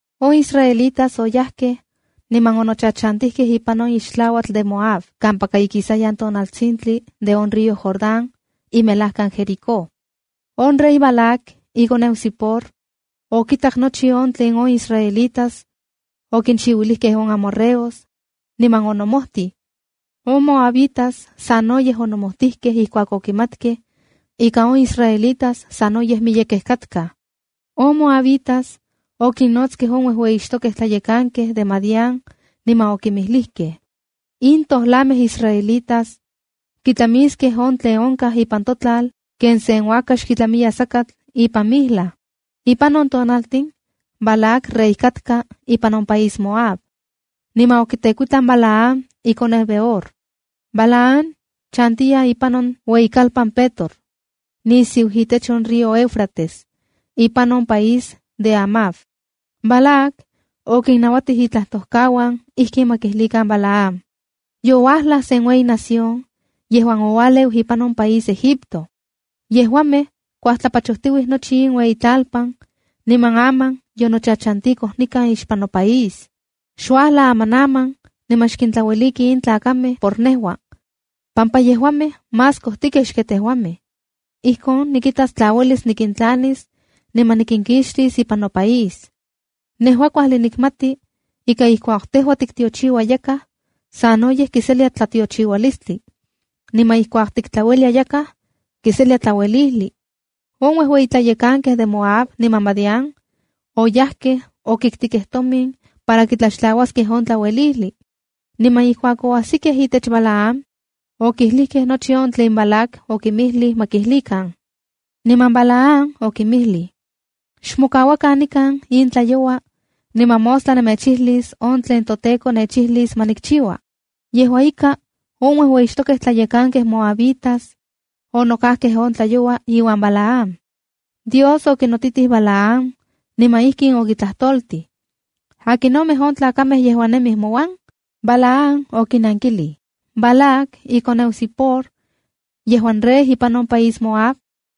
On israelitas oyajkej niman onochachantijkej ipan on ixtlauatl de Moab, kampaka ikijsayan tonaltsintli de on río Jordán, imelajkan Jericó. On rey Balac, ikoneu Zipor, okitak nochi on tlen on israelitas okinchiuilijkej on amorreos niman onomojtij. On moabitas no sanoyej onomojtijkej ijkuak okimatkej ika on israelitas sanoyej miyekej katkaj. On moabitas okinnotskej on uejueyixtokej tlayekankej de Madián niman okinmijlijkej: “In tojlanmej israelitas kitlamiskej on tlen onkaj ipan totlal, ken sen uakax kitlamiya sakatl ipan mijlaj.” Ipan on tonaltin Balac rey katka ipan on país Moab, niman okitekuitlan Balaam, ikoneu Beor. Balaam chantiya ipan on ueyikalpan Petor, nisiu itech on río Éufrates, ipan on País de Amav. Balac okinnauatij itlajtojkauan ijkin ma kijlikan Balaam: “Youajlaj sen ueyi nación yejuan oualeu ipan on país Egipto. Yejuamej kuajtlapachojtiuij nochi on ueyitlalpan, niman aman yonochachantikoj nikan ixpan nopaís. Xuajla amanaman, niman xkintlaueliki in tlakamej por nejua, pampa yejuamej más kojtikej xken tejuamej. Ijkon nikitas tla uelis nikintlanis niman nikinkixtis ipan nopaís. Nejua kuajli nikmati ika ijkuak tejua tiktiochiua yakaj, sanoyej kiselia tlatiochiualistli, niman ijkuak tiktlauelia yakaj, kiselia tlauelijli.” On uejueyitlayekankej de Moab niman de Madián, oyajkej okiktikej tomin para kitlaxtlauaskej on tlauelijli. Niman ijkuak oasikej itech Balaam, okijlijkej nochi on tlen Balac okinmijlij ma kijlikan. Niman Balaam okinmijlij: —Xmokauakan nikan in tlayoua, niman mostla nemechijlis on tlen noTEKO nechijlis ma nikchiua. Yejua ika, on uejuejixtokej tlayekankej moabitas onokajkej on tlayoua iuan Balaam. Dios okinotitij Balaam, niman ijkin okitlajtoltij: —¿Akinomej on tlakamej yejuan nemij mouan? Balaam okinankilij: —Balac, ikoneu Zipor yejuan rey ipan on país Moab,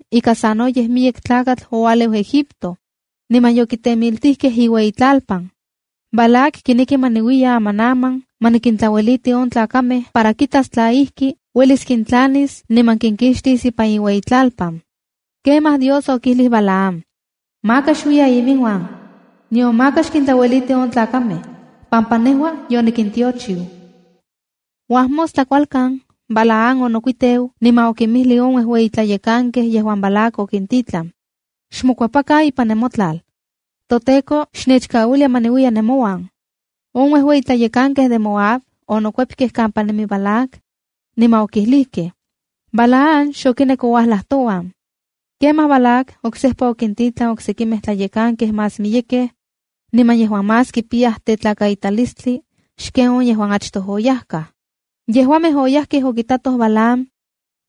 ika sanoyej miyek tlakatl oualeu Egipto, niman yokitemiltijkej iueyitlalpan. Balac kineki ma niuiya amanaman ma nikintlaueliti on tlakamej para kitas tla ijki uelis kintlanis niman kinkixtis ipan iueyitlalpan. Kemaj Dios okijlij Balaam: —Maka xuiya iminuan, nion maka xkintlaueliti on tlakamej, pampa nejua yonikintiochiu. Uajmostla kualkan Balaam onokuiteu niman okinmijlij on uejueyitlayekankej yejuan Balac okintitlan: —Xmokuepakan ipan nemotlal, toTEKO xnechkauilia ma niuiya nemouan. On uejueyitlayekankej de Moab onokuepkej kampa nemi Balac, niman okijlijkej: —Balaam xokinek ouajlaj touan. Kemaj Balac oksejpa okintitlan oksekimej tlayekankej más miyekej, niman yejuan más kipiyaj tetlakaitalistli xken on yejuan achtoj oyajkaj. Yejuamej oyajkej okitatoj Balaam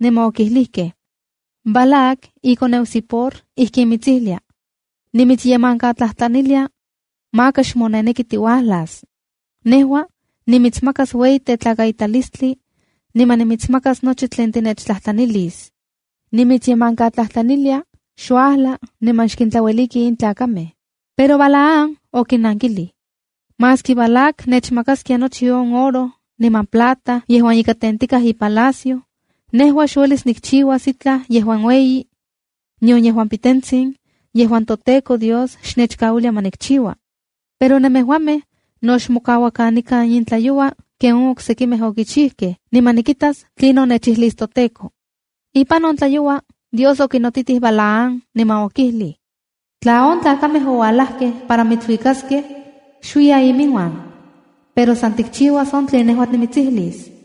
niman okijlijkej: —Balac, ikoneu Zipor ijkin mitsijlia: “Nimitsyemankatlajtlanilia, maka xmoneneki tiuajlas. Nejua nimitsmakas ueyi tetlakaitalistli niman nimitsmakas nochi tlen tinechtlajtlanilis. Nimitsyemankatlajtlanilia, xuajla niman xkintlaueliki in tlakamej.” Pero Balaam okinnankilij: —Maski Balac nechmakaskia nochi on oro niman plata yejuan ika tentikaj ipalacio, nejua xuelis nikchiuas itlaj yejuan ueyi, nion yejuan pitentsin, yejuan noTEKO Dios xnechkauilia ma nikchiua. Pero nemejuamej no xmokauakan nikan in tlayoua ken on oksekimej okichijkej, niman nikitas tlinon nechijlis noTEKO. Ipan on tlayoua Dios okinotitij Balaam niman okijlij: —Tla on tlakamej oualajkej para mitsuikaskej, xuiya iminuan. Pero san tikchiuas on tlen nejua nimitsijlis.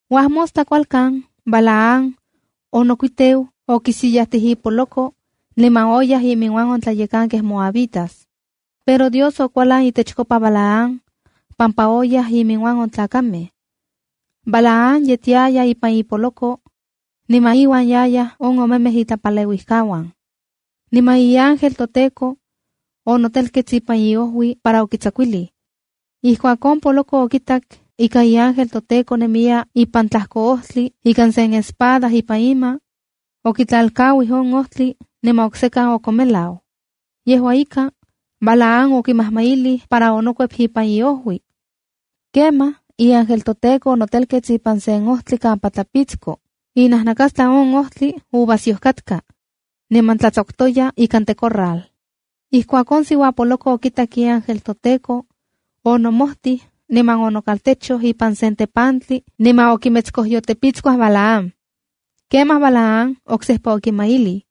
Uajmostla kualkan Balaam onokuiteu, okisillajtij ipoloko niman oyaj iminuan on tlayekankej moabitas. Pero Dios okualan itechkopa Balaam pampa oyaj iminuan on tlakamej. Balaam yetiaya ipan ipoloko niman iuan yayaj omemej itlapaleuijkauan. Niman iángel toTEKO, onotelkets ipan iojui para okitsakuilij. Ijkuak on poloko okitak ika iángel toTEKO nemiya ipan tlajko ojtli ika sen espada ipan ima, okitlalkauij on ojtli niman oksekan okonmelau. Yejua ika, Balaam okimajmailij para onokuep ipan iojui. Kemaj iángel toTEKO onotelkets ipan sen ojtli kampa tlapitsko, inajnakastlan on ojtli uvasyoj katka, niman tlatsakutoya ikan tecorral. Ijkuak on poloko okitak iángel toTEKO, onomojtij niman onokaltechoj ipan sen tepantli niman okimetskojyotepitskuaj Balaam. Kemaj Balaam oksejpa okimailij.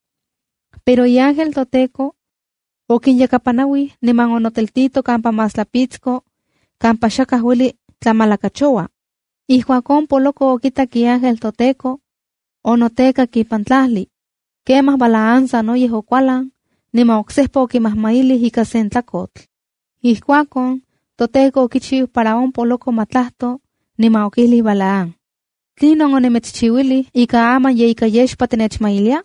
Pero iángel toTEKO okinyakapanauij niman onoteltito kampa más tlapitsko, kampa xakaj ueli tlamalakachoua. Ijkuak on poloko okitak iángel toTEKO, onotekak ipan tlajli. Kemaj Balaam sanoyej okualan, niman oksejpa okimajmailij ika sen tlakotl. Ijkuakon toTEKO okichiu para on poloko ma tlajto, niman okijlij Balaam: —¿Tlinon onimitschiuilij ika aman ye ika yexpa tinechmailia?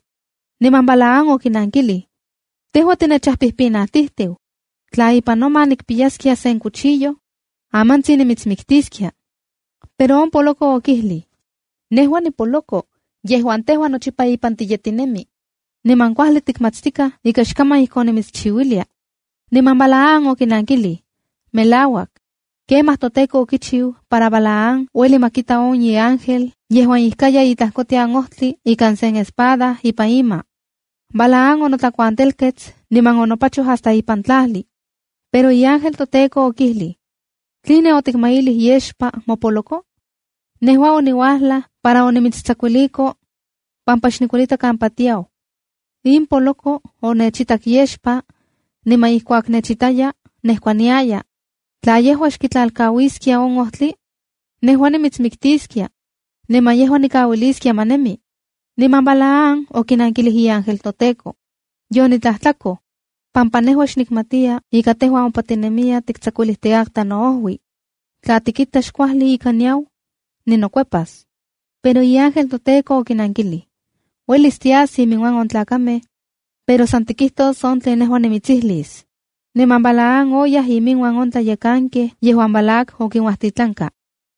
Niman Balaam okinankilij: —Tejua tinechajpijpinauijtiu. Tla ipan noma nikpiyaskia sen cuchillo, amantsin timitsmiktiskia. Pero on poloko okijlij: —Nejua nipoloko yejuan tejua nochipa ipan tiyetinemi. Niman kuajli tikmatstikaj ika xkaman ijkon nimitschiuilia. Niman Balaam okilij: —Melauak. Kemaj toTEKO okichiu para Balaam ueli ma kita on iángel yejuan ijkaya itlajkotian ojtli ika sen espada ipan ima. Balaam onotlakuantelkets, niman onopachoj hasta ipan tlajli. Pero iángel toTEKO okijlij: —¿Tline otikmailij yexpa mopoloko? Nejua oniuajlaj para onimitstsakuiliko pampa xnikuelita kampa tiau. In poloko onechitak yexpa, niman ijkuak nechitaya nejkuaniaya. Tla yejua xkitlalkauiskia on ojtli, nejua nimitsmiktiskia, niman yejua nikauiliskia ma nemi. Niman Balaam okinankilij iángel toTEKO: —Yonitlajtlakoj, pampa nejua xnikmatiya ika tejua ompa tinemiya tiktsakutikatka noojui. Tla tikita xkuajli ika niau, ninokuepas. Pero iángel toTEKO okinankilij: —Uelis tias iminuan on tlakamej, pero san tikijtos on tlen nejua nimitsijlis. Niman Balaam oyaj iminuan on tlayekankej yejuan Balac okinuajtitlanka.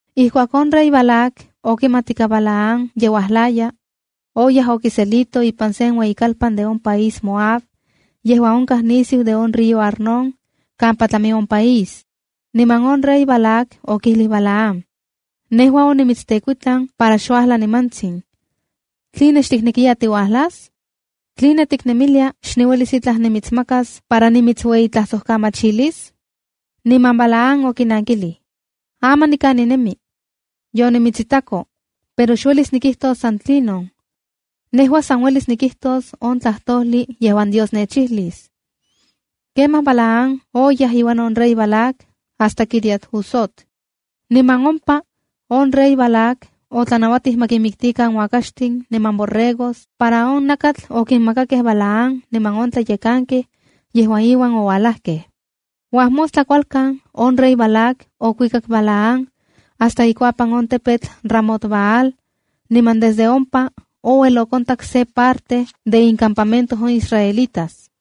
Ijkuak on rey Balac okimat ika Balaam ye uajlaya, oyaj okiselito ipan sen ueyikalpan de on país Moab yejuan onkaj nisiu de on río Arnón, kampa tlami on país. Niman on rey Balac okijlij Balaam: —Nejua onimitstekuitlan para xuajla nimantsin. ¿Tline xtiknekiya tiuajlas? ¿Tline tiknemilia xniuelis itlaj nimitsmakas para nimitsueyitlajsojkamachilis? Niman Balaam okinankilij: —Aman nikan ninemi. Yonimitsitako. Pero xuelis nikijtos san tlinon. Nejua san uelis nikijtos on tlajtojli yejuan Dios nechijlis. Kemaj Balaam oyaj iuan on rey Balac hasta Quiriat-huzot. Niman ompa on rey Balac otlanauatij ma kinmiktikan uakaxtin niman borregos para on nakatl okinmakakej Balaam niman on tlayekankej yejuan iuan ouajlajkej. Uajmostla kualkan, on Rey Balac okuikak Balaam hasta ikuapan on tepetl Ramot-baal niman desde ompa ouel onkontak se parte de incampamento on israelitas.